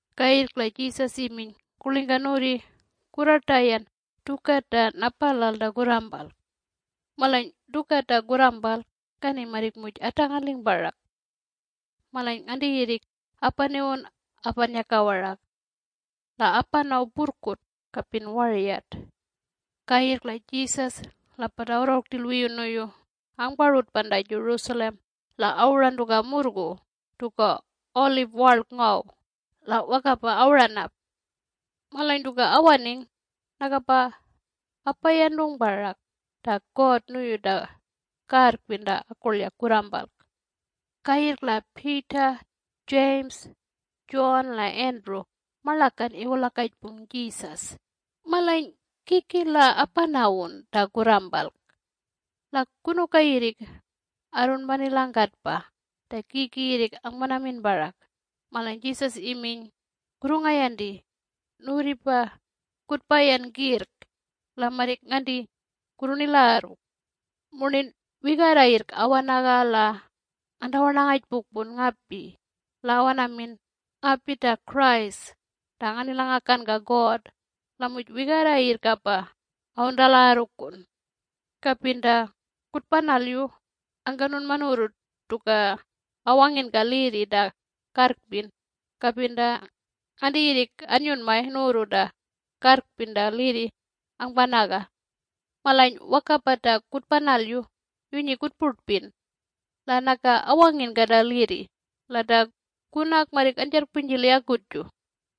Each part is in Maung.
Kayirrk la Jesus iminy, “Kurlingka nuwurri kurrartayan tuka ta napalal ta kurrampalk? Malany tuka ta kurrampalk kani marrik muj atangaling parak. Malany nganti yirrik apaniwun apannyaka warak. La apanaw purrkut kapin waryat.” Kayirrk la Jesus la pata awarrangung rtil wiyu nuyu angparutpan ta Jerusalem la awuran tuka murrgu tuka Olive warlk ngaw la wakapa awuran ap. Malany tuka awaning nakapa apayantung parak ta God nuyu ta karrpin mira ta akurlyak kurrampalk. Kayirrk la Peter, James, John la Andrew marlakan iwulakajpung Jesus, “Malany kiki la apanawun ta kurrampalk? La kunuka yirrik arrunpanilangkatpa ta kiki yirrik angpanamin parak?” Malany Jesus iminy, “Kurrungayanti! Nuwurripa kutpayan kirrk la marrik nganti kurrunilagarru. Murnin wigarra yirrk awanaga la ngantawarnangapukpun ngapi la awanamin ‘Ngapi ta Christ ta nganilangakanka God,’ la muj wigarra yirrkapa awuntalagarrukun. Kapin ta kutpanalyu angkanunma nuwurru tuka awanginka lirri ta karrpin, kapin ta nganti yirrik annyunmay nuwurru ta karrpin ta lirri angpanaga. Malany wakapa ta kutpanalyu yunyi kutpurtpin. La naka awanginka ta lirri la ta kunak marrik anjarrkpunyjili akutju.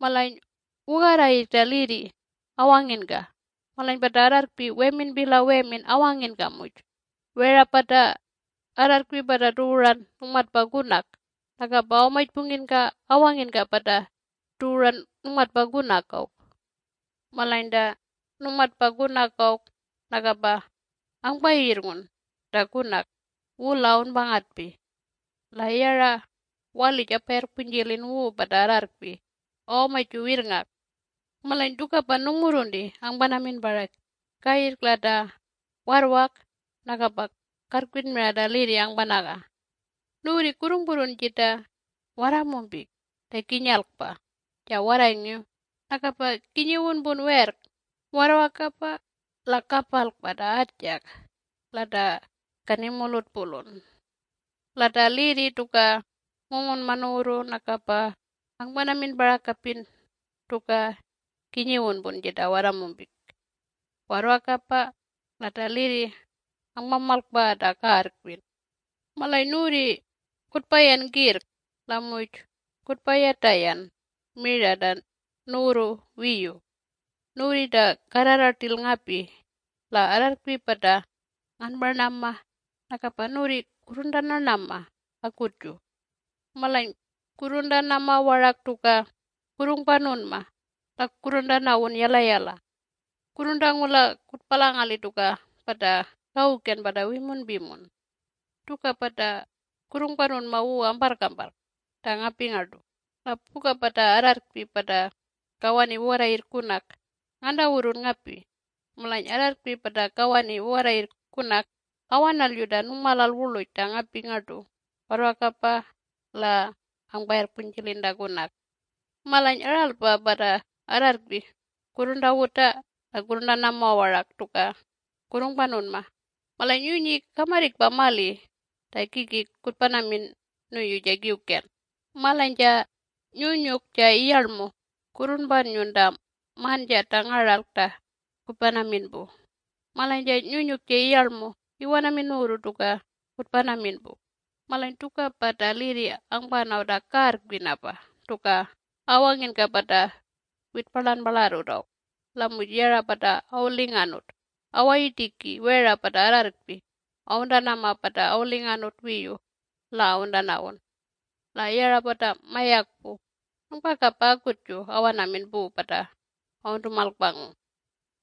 Malany wugarra yirrk ta lirri awanginka. Malany pata arrarrkpi weminpi la wemin awanginka la muj wera pata arrarrkpi pata tuwuran nungmatpa kunak nakapa awamajpungkinka awanginka pata tuwuran nungmatpa kunak awk. Malany ta nungmatpa kunak awk nakapa angpayirrngun ta kunak wula awunpangatpi. La yara walij apayarrkpunyjilin wu pata arrarrkpi awamaju wirrngak. Malany tukapa nungmurrunti angpanamin parak kayirrk la ta warrwak nakapa karrkpin mira ta lirri angpanaga. Nuwurri kurrungpurrun jita warramumpik ta kinyalkpa ja warrayngiw nakapa kinyiwunpun werrk warrwakapa la kapalkpa ta atjak la ta kanimurlutpurlun. La ta lirri tuka ngungunman nuwurru nakapa angpanamin parak kapin tuka kinyiwunpun jita warramumpik. Warrwakapa la ta lirri angpamalkpaga ta karrpin. Malany nuwurri kutpayan kirrk la muj kutpayatayan mira ta nuwurru wiyu. Nuwurri ta karrarra rtil ngapi la arrarrkpi pata nganparnama nakapa nuwurri kurruntarnama akutju. Malany kurruntanama warak tuka kurrungpanunma la kurruntanawun yalayala. Kurruntangula kutpalangali tuka pata kawuken pata wimunpimun. Tukapa ta kurrungpanunma wu amparrkamparrk ta ngapi ngartu, la puka pata arrarrkpi pata kawani wugarra yirrk kunak ngantawurrun ngapi. Malany arrarrkpi pata kawani wugarra yirrk kunak awanalyu ta nungmalal wurluj ta ngapi ngartu warrwakapa la angpayarrkpunyjilin ta kunak. Malany aralpa pata arrarrkpi kurruntawuta la kurruntanama warak tuka kurrungpanunma malany yunyi kamarrikpa mali ta kiki kutpanamin nuyu ja kiwken. Malany ja Nyunyuk ja Iyarlmu kurrunpannyun ta manjat ta ngaralk ta kutpanamin pu malany ja Nyunyuk ja Iyarlmu iwanamin nuwurru tuka kutpanamin pu. Malany tukapa ta lirri angpanaw ta karrkpinapa tuka awanginka pata witparlanparlarrut awk. La muj yara pata awulinganut awayirtiki wera pata arrarrkpi awuntanama pata awulinganut wiyu la awuntanawun. La yara pata mayakpu nungpakapa akutju awanamin pu pata awuntumalkpangung.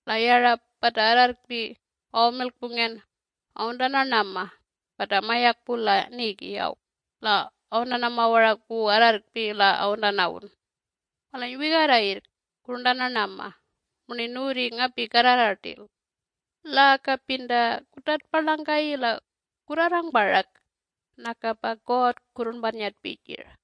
La yara pata arrarrkpi awamilkpungen awuntarnanama pata mayakpu la nigi awk la awuntanama warak wu arrarrkpi la awuntanawun. Malany wigarra yirrk kurruntanarnama murnin nuwurri ngapi karrarra rtil. La kapin ta kutartparlangkayi la kurrarrang parak nakapa God kurrunpannyatpi jir.”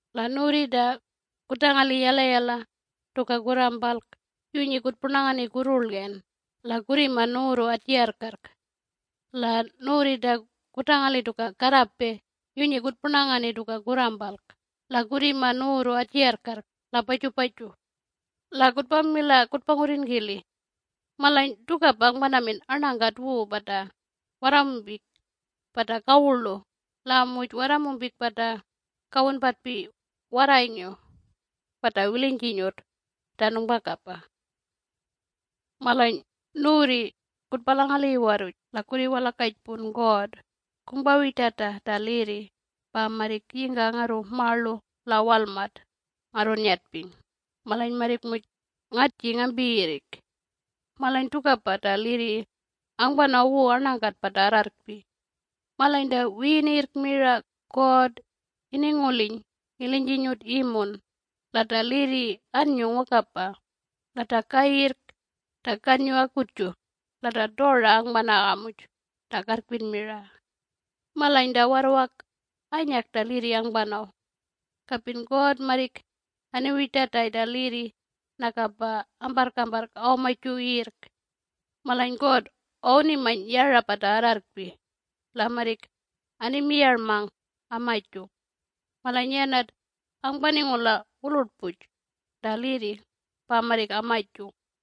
La nuwurri ta kutangali yalayala tuka kurrampalk yunyi kutpurnangani kurrurlgen la kurrimang nuwurru atjigarrkarrk. La nuwurri ta kutangali tuka karrape yunyi kutpurnangani tuka kurrampalk la kurrimang nuwurru atjigarrkarrk la pajupaju. La kutpamila kutpangurrin kili. Malany tukapa angpanamin arnakat wu pata warramumpik pata kawurlu la muj warramumpik pata kawunpatpi warrayngiw pata wilinyjinyut ta nungpakapa. Malany nuwurri kutpalangali iwarruj la kurriwalakajpun God, ‘Kungpawirtata ta lirri pa marrik yingka ngarru marlu la walmat ngarrunnyatping malany marrik muj ngatjing ngampi yirrik.’ Malany tukapa ta lirri angpanaw wu arnangkat pata arrarrkpi. Malany ta wiyinirrk mira God ininguliny ilinyjinyut imun la ta lirri annyung wakapa la ta kayirrk ta kannyu akutju la ta tora angpanaga muj ta karrkpin mira. Malany ta warrwak anyak ta lirri angpanaw. Kapin God marrik aniwirtatay ta lirri nakapa amparrkamparrk awamaju yirrk. Malany God awunimany yara pata arrarrkpi la marrik animiyarmang amajung. Malany yanat angpaningula wulurtpuj ta lirri pa marrik amajung.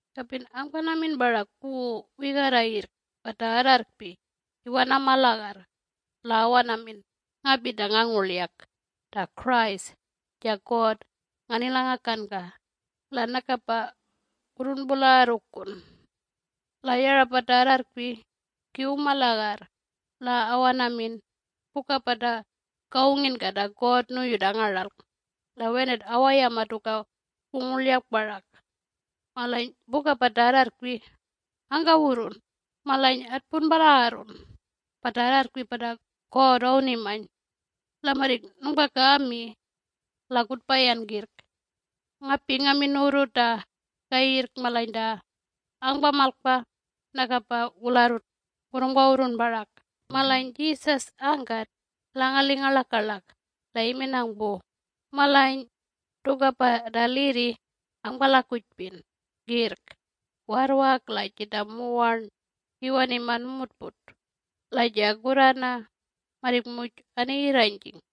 Kapin angpanamin parak wu wigarra yirrk pata arrarrkpi iwanamalagarr la awanamin, ‘Ngapi ta ngangurlyak ta Christ ja God nganilangakanka,’ la nakapa kurrunpulagarrukun. La yara pata arrarrkpi kiwuma lagarr la awanamin puka pata kawunginka ta God nuyu ta ngaralk, la wenat awayama tuka wungurlyak parak. Malany puka pata arrarrkpi angkawurrun, ‘Malany atpunpalagarrun pata arrarrkpi pata God awunimany.’ La marrik nungpaka angmi. La kutpayan kirrk! Ngapi ngamin nuwurru ta kayirrk malany ta angpamalkpa nakapa wularrut kurrungpawurrun parak.” Malany Jesus angkat ilangaling ngarlakalak la iminang pu, “Malany tukapa ta lirri angpalakujpin kirrk warrwak la jita muwarn iwanima numurtput la ja kurrana marrik muj aniyirranyjing.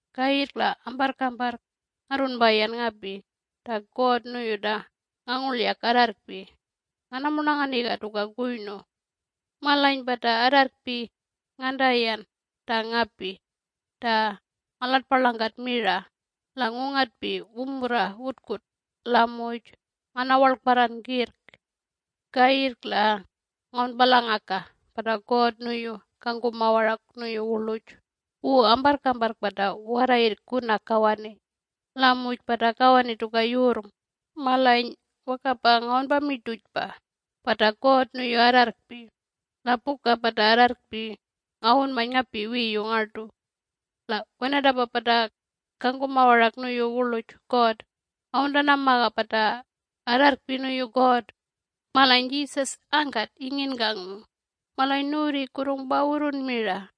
Kayirrk la amparrkamparrk ngarrunpayan ngapi ta God nuyu ta ngangurlyak arrarrkpi nganamurnanganiga tuka kuynu. Malany pata arrarrkpi ngantayan ta ngapi ta ngalatparlangkat mira la ngungatpi wumurra wutkut la muj nganawarlkparran kirrk. Kayirrk la ngawunpalangaka pata God nuyu kangkuma warak nuyu wurluj wu amparrkamparrk pata wugarra yirrk kunak kawani la muj pata kawani tuka yurrng malany wakapa ngawunpamirtujpa pata God nuyu arrarrkpi - la puka pata arrarrkpi ngawunmany ngapi wiyu ngartu. La wenatapa pata kangkuma warak nuyu wurluj God awuntanamaga pata arrarrkpi nuyu God.” Malany Jesus angkat inginkangung, “Malany nuwurri kurrungpawurrun mira.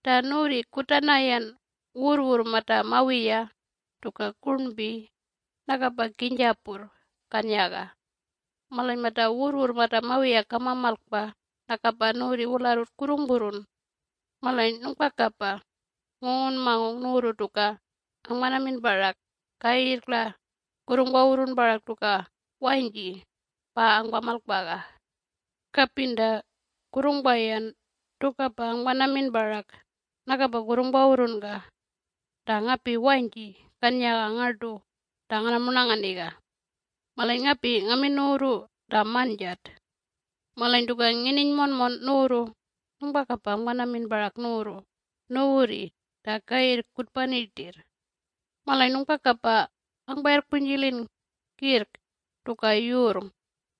Ta nuwurri kutanayan wurrwurr mata mawiya tuka kurnpi nakapa kinyjapurr kanyaga. Malany mata wurrwurr mata mawiya kamamalkapa nakapa nuwurri wularrut kurrungpurrun. Malany nungpakapa ngungunmangung nuwurru tuka angpanamin parak kayirrk la kurrungpawurrun parak tuka wanyji pa angpamalkpaga. Kapin ta kurrungpayan tukapa angpanamin parak nakapa kurrungpawurrunka ta ngapi wanyji kannyaga ngartu ta nganamurnanganiga. Malany ngapi nganamin nuwurru ta manjat! Malany tuka ngininy monmon nuwurru nungpakapa angpanamin parak nuwurru nuwurri ta kayirrk kutpani rtirr. Malany nungpakapa angpayarrkpunyjilin kirrk tuka yurrng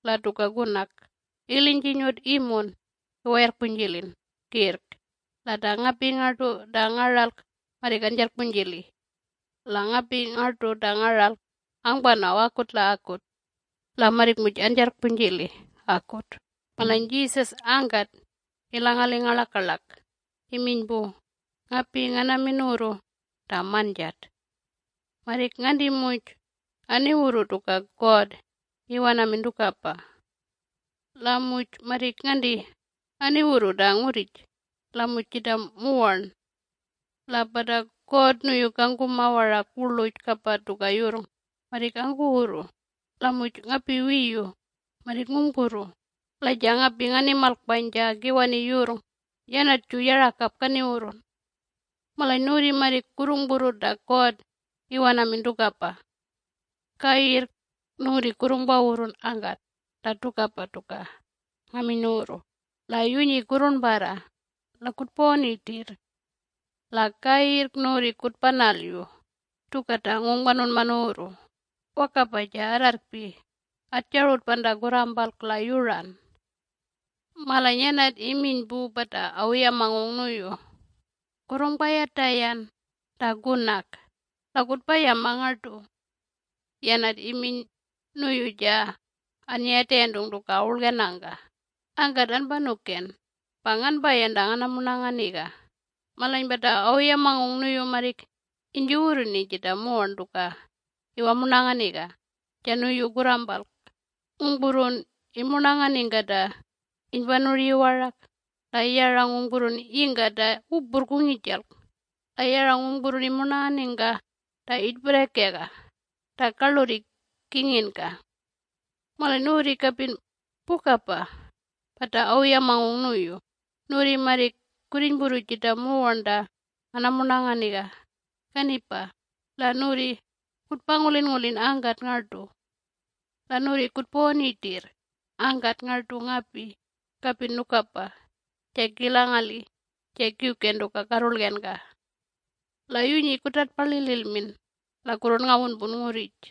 la tuka kunak - ilinyjinyut imun iwayarrkpunjilin kirrk la ta ngapi ngartu ta ngaralk marrik anjarrkpunyjili. La ngapi ngartu ta ngaralk angpanaw akut la akut. La marrik muj anjarrkpunyjili akut.” Malany Jesus angkat ilangaling ngarlakalak iminy pu, “Ngapi nganamin nuwurru ta manjat! Marrik nganti muj aniwurru tuka God iwanamin tukapa. La muj marrik nganti aniwurru ta ngurrij la muj jita muwarn. La pata God nuyu kangkuma warak wurluj kapa tuka yurrng marrik angkuwurru la muj ngapi wiyu marrik ngungpurru. La ja ngapi nganimalkpany ja kiwani yurrng yanatju yarakap kaniwurrun. Malany nuwurri marrik kurrungpurru ta God iwanamin tukapa. Kayirrk nuwurri kurrungpawurrun angkat ta tukapa tuka ngaminy nuwurru - la yunyi kurrurnparra la kutpawani rtirr. La kayirrk nuwurri kutpanalyu tuka ta ngungpanunma nuwurru. Wakapa ja arrarrkpi atjarutpan ta kurrampalk la yuran. Malany yanat iminy pu pata awuyamangung nuyu, “Kurrungpayatayan ta kunak la kutpayama ngartu.” Yanat iminy nuyu ja annyayatayantung tuka awurlgenangka, “Angkat anpanuken pa nganpayan ta nganamurnanganiga.” Malany pata awuyamangung nuyu marrik inyjuwurruni jita muwarn tuka iwamurnanganiga ja nuyu kurrampalk. Ngungpurrun imurnanganingka ta inypanuryi warak la yara ngungpurrun yingka ta wupurrk wungijalk la yara ngungpurrun imurnanganiga ta iyirtpirrakega ta karlurri kinginka. Malany nuwurri kapin pukapa pata awuyamangung nuyu - nuwurri marrik kurrinypurru jita muwarn ta nganamurnanganiga kanipa la nuwurri kutpangulinngulin angkat ngartu. La nuwurri kutpawani rtirr angkat ngartu ngapi kapin nukapa ja kilangali ja kiwken tuka karrurlgenka. La yunyi kutartpalililmin la kurrunngawunpun ngurrij.